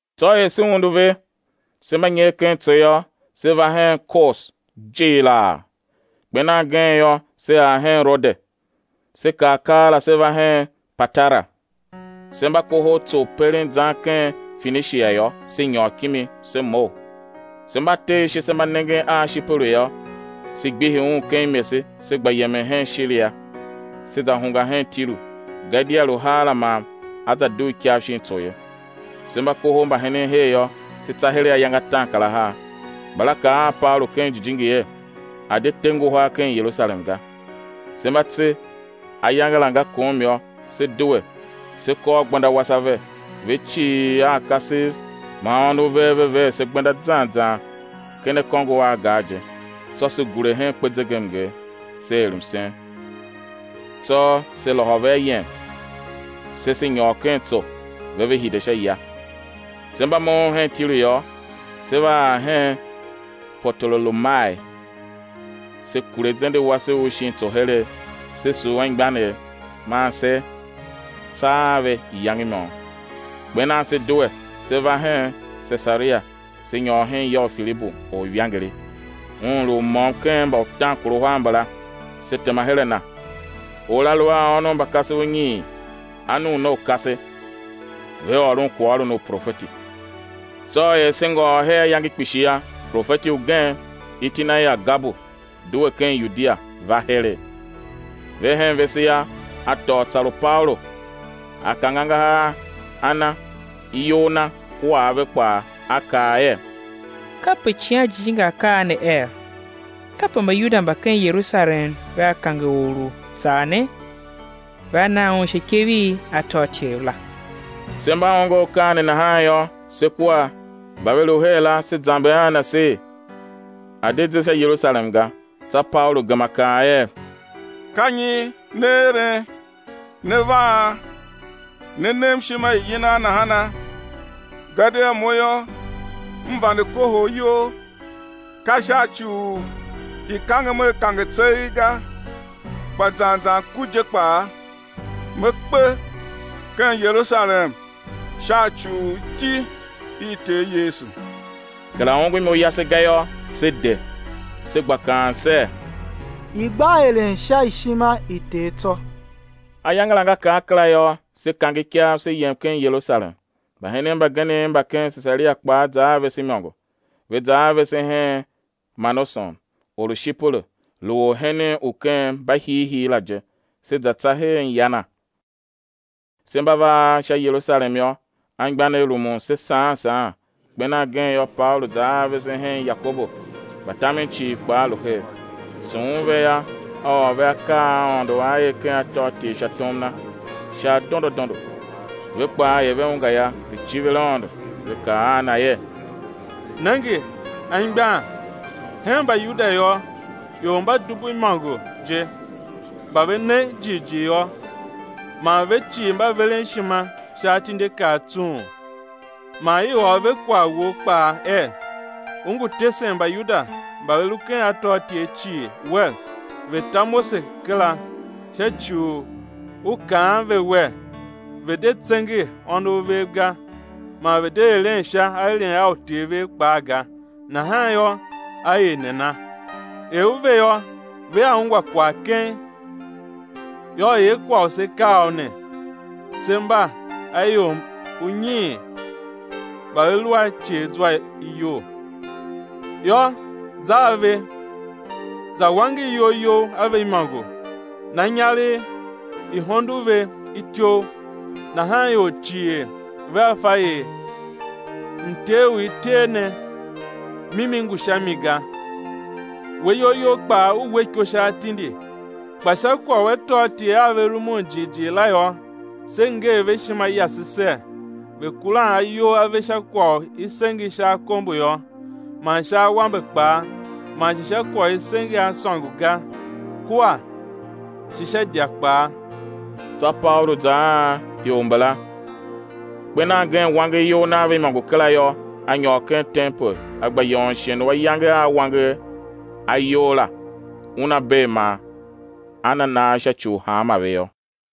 Tsô er se undu ve, se mba nyer ken tso yô, se va hen Kos jighilaa. Kper nan gen yô, se ar hen Rode, se kar keela, se va hen Patara. Se mba kohol tso u peren zan ken Fenishia yô, se nyôr kimi, se mough. Se mba te ashe se mba nengen a Shiperu yô, se gbihi un ken imese se gba yemen hen Shiria, se za hungwa hen Tiru, gadia lu heera man á za dugh ikav shin tso ye. Se mba kohol mbahenen her yô, se tsa heregh ayange ataankarahar, mbala kaa a Paulu ken Jijingi er, a̱ de te nguhar ken Yerusalem ga. Se mba tse ayange la nga kom yô, se due, se kôr gbenda wase ave; ve cii a kasev man ônov ve ver se gbenda zan zan ken akôngo a gar je; tsô se gure hen kpezegemnger, se er msen; tsô se lôhô ve ayem, se se nyôr ken tso, ve ve hide sha ya. Se mba moughon hen Tiru yô, se va ar hen Potolomai, se kure zende wase u shin tso heregh; se sugh anmgbianev, man se tsa a ve iyange i môm. Kper nan se due, se va hen Sesaria, se nyôr hen ya u Filibu, orivangeli, un lu u môm ken mba utaankaruhar mbala, se tema her a na. Or la lu a ônov mba kasev unyiin, anuunaukase, ve ôron kwaghôron u profeti. Tsô er se ngôôr her ayange kpishi yô, profeti ugen, iti na er Agabu, due ken Yudia, va heregh. Ve hen vese yô, a tôô tsar u Paulu, a kange angahar a na iyol na kua ave kpaa, a kaa er: Kape Icighan Jijingi A kaa ne er: Kape Mbayuda mba ken Yerusalem vea kange or u tsar ne, vea na un sha ikev i atôatyev la. Se mba ongo akaa ne nahan yô, se kua mba ve lu her la, se zamber a na ser, a̱ de ze sha Yerusalem ga. Tsô Paulu gema kaa er: Ka nyi ne eren, ne vaan, ne nem ishima i yinan nahana? Gadia mo yô, m vande kohol iyol, ka sha ci u i̱ kangem a kange tseegh ga, kpa zan zan ku je kpaa, me kpe ken Yerusalem, sha ci u iti i Ter Yesu. Kera ongo imo yase ga yô, se de, se gba kaan ser: I̱ gba eren sha ishima i Ter tsô. Ayange la nga kar kera yô, se kange ikav, se yem ken Yerusalem. Mbahenen mbagenev mba ken Sesaria kpaa za a vese imôngo, ve za a vese hen Manason, or u Shiperu lu orhenen u ken mbahiihii la je, se za tsa hen ya na. Se mba va ar sha Yerusalem yô, anmgbianev rumun se saan saan. Kper nan gen yô, Paulu za a vese hen Yakobu; mbatamen cii kpaa lu her. Sughun ve yô, a ôr ve akaa a Aôndo A er ken atôatyev sha tom na, sha adondo adondo. Ve kpaa er ve ungwa yô, ve civir Aôndo; ve kaa a na er: Nenge anmgbian, hen Mbayuda yô, ior mba dubu imôngo je, mba ve ne jighjigh yô, mba veren ishima sha atindiakaa tsung. Man i ôr ve kwagh wou kpaa er, u ngu tesen Mbayuda mba ve lu ken atôatyev cii, wer, ve̱ ta Mose kera sha ci u u kaan ve wer, ve̱ de tsenge ônov vev ga, man ve̱ de eren sha aeren a uter vev kpaa ga. Nahan yô, á er nana? Er u ve yô, vea ungwa keng. Yô, er kwagh u se kaa u ne: se mba a ior unyiin mba ve lu a iceghzwa iyol. Yô, za a ve, za wanger iyol you a ve imôngo, na inyaregh i̱ hondo ve ityouv, nahan ior cii vea fa er mter u i ter u ne, mimi ngu sha mi ga, we iyol you kpaa u we iko sha atindi. Kpa sha kwagh u atôatyev a ve rumun jighjigh la yô, se nger ve ishima yase ser: Ve̱ kuran ayol a ve sha kwagh u i senge sha akombo yô, man sha awambe kpaa, man shi sha kwagh u i senge a sôngo ga, kua shi sha idya kpaa. Tsô Paulu za a ior mbala; kper nan gen wanger iyol na a ve imôngo kera yô, a nyôr ken tempel, a gba yôôn shighe u ayange a wanger ayol la una bee man á na nagh sha ci u hanmô ve yô.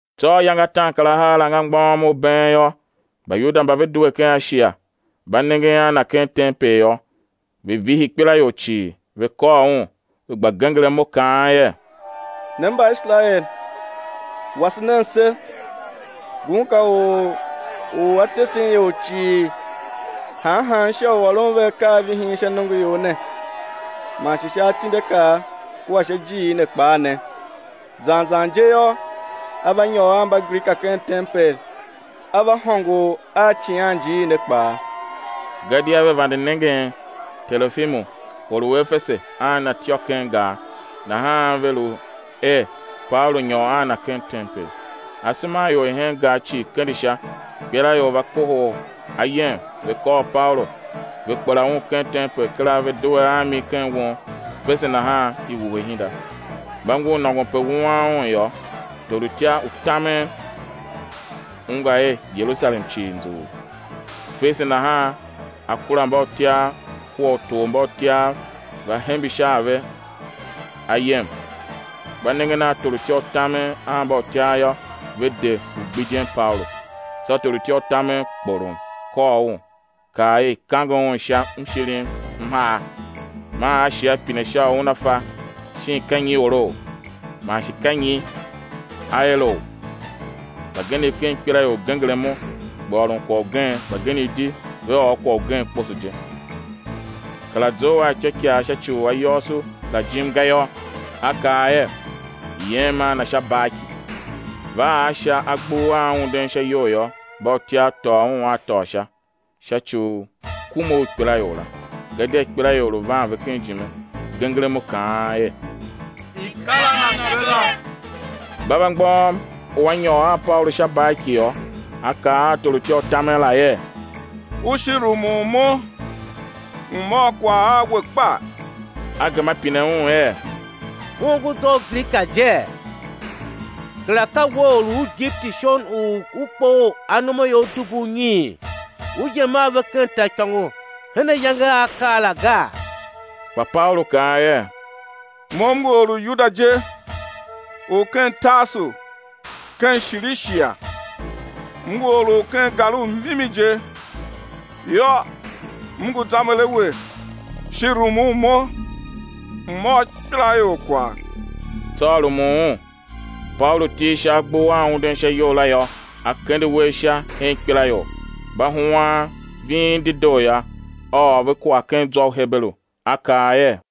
Tsô ayange a ataankarahar la nga mgbôghom u been yô, Mbayuda mba ve due ken Ashia, mba nengen a na ken tempel yô, ve vihi ikpelaior cii, ve kôr un, ve gba genger imo kaan er: Ne Mbaiserael, wase nen se! Ngun ka or u a tesen ior cii han han sha u ôron ve akaavihin sha nongoior ne, man shi sha atindiakaa kua sha ijiir ne kpaa ne zan zan je yô, a va nyôr a Mbagrika ken tempel a va hôngor a icighanjiir ne kpaa. Gadia ve vande nengen Terofimu, or u Efese, a na ityô ken gar, nahan lu ve er, Paulu nyôr a na ken tempel. Asema a ior i hen gar cii kende sha, ikpelaior va kohol ayem, ve kôr Paulu, ve kpela un ken tempel kera, ve due a mi ken won; fese nahan i wuhe ihinda. Mba ngur nôngon pe wuan un yô, torutya u tamen ungwa er Yerusalem cii nzughul; fese nahan a kura mbautyav kua utormbautyav va hembe sha a ve ayem; mba nengen a torutya u tamen a mbautyav yô, ve de u gbidyen Paulu. Tsô torutya u tamen kporom, kôr un, kaa er i̱ kange un sha mshirim m har; man a shi pine sha u una fa shin ka nyi orou, man shi ka nyi a erou. Mbagenev ken ikpelaior genger imo, gba ôron kwagh ugen, mbagenev di ve ôr kwagh ugen kposo je; kera zough a ityôikaa sha ci u ayôôso la jim ga yô, a kaa er, i̱ yem a na sha barki. Va ar sha agbur a unden sha iyou yô, mbautyav tôô un a tôô sha, sha ci u kume u ikpelaior la, gadia ikpelaior lu van ve ijime, genger imo, kaan er: I̱ kar a na kera! Mba va mgbôghom u á nyôr a Paulu sha barki yô, a kaa a torutya u tamen la er: U shi rumun mo, m̱ ôr kwagh a we kpa? A gema a pine un er: U ongo zwa u Grika jee? Kera ka we or u Igipiti shon u u kpoghol anomaior dubu unyiin, u yem a ve ken taaikôngo hen ayange a a kar la gaa? Kpa Paulu kaa er: Mo m ngu or u Yuda je u ken Tarsu ken Shilishia, m ngu or u ken gar u mimi je, yô, m ngu zamber a we, shi rumun mo, m̱ ôr ikpelaior kwagh. Tsô a rumun un. Paulu, til sha agbur a unden sha iyou la yô, a kende uwegh sha hen ikpelaior. Mba huan ving dedoo yô, a ôr ve kwagh ken zwa u Heberu, a kaa er: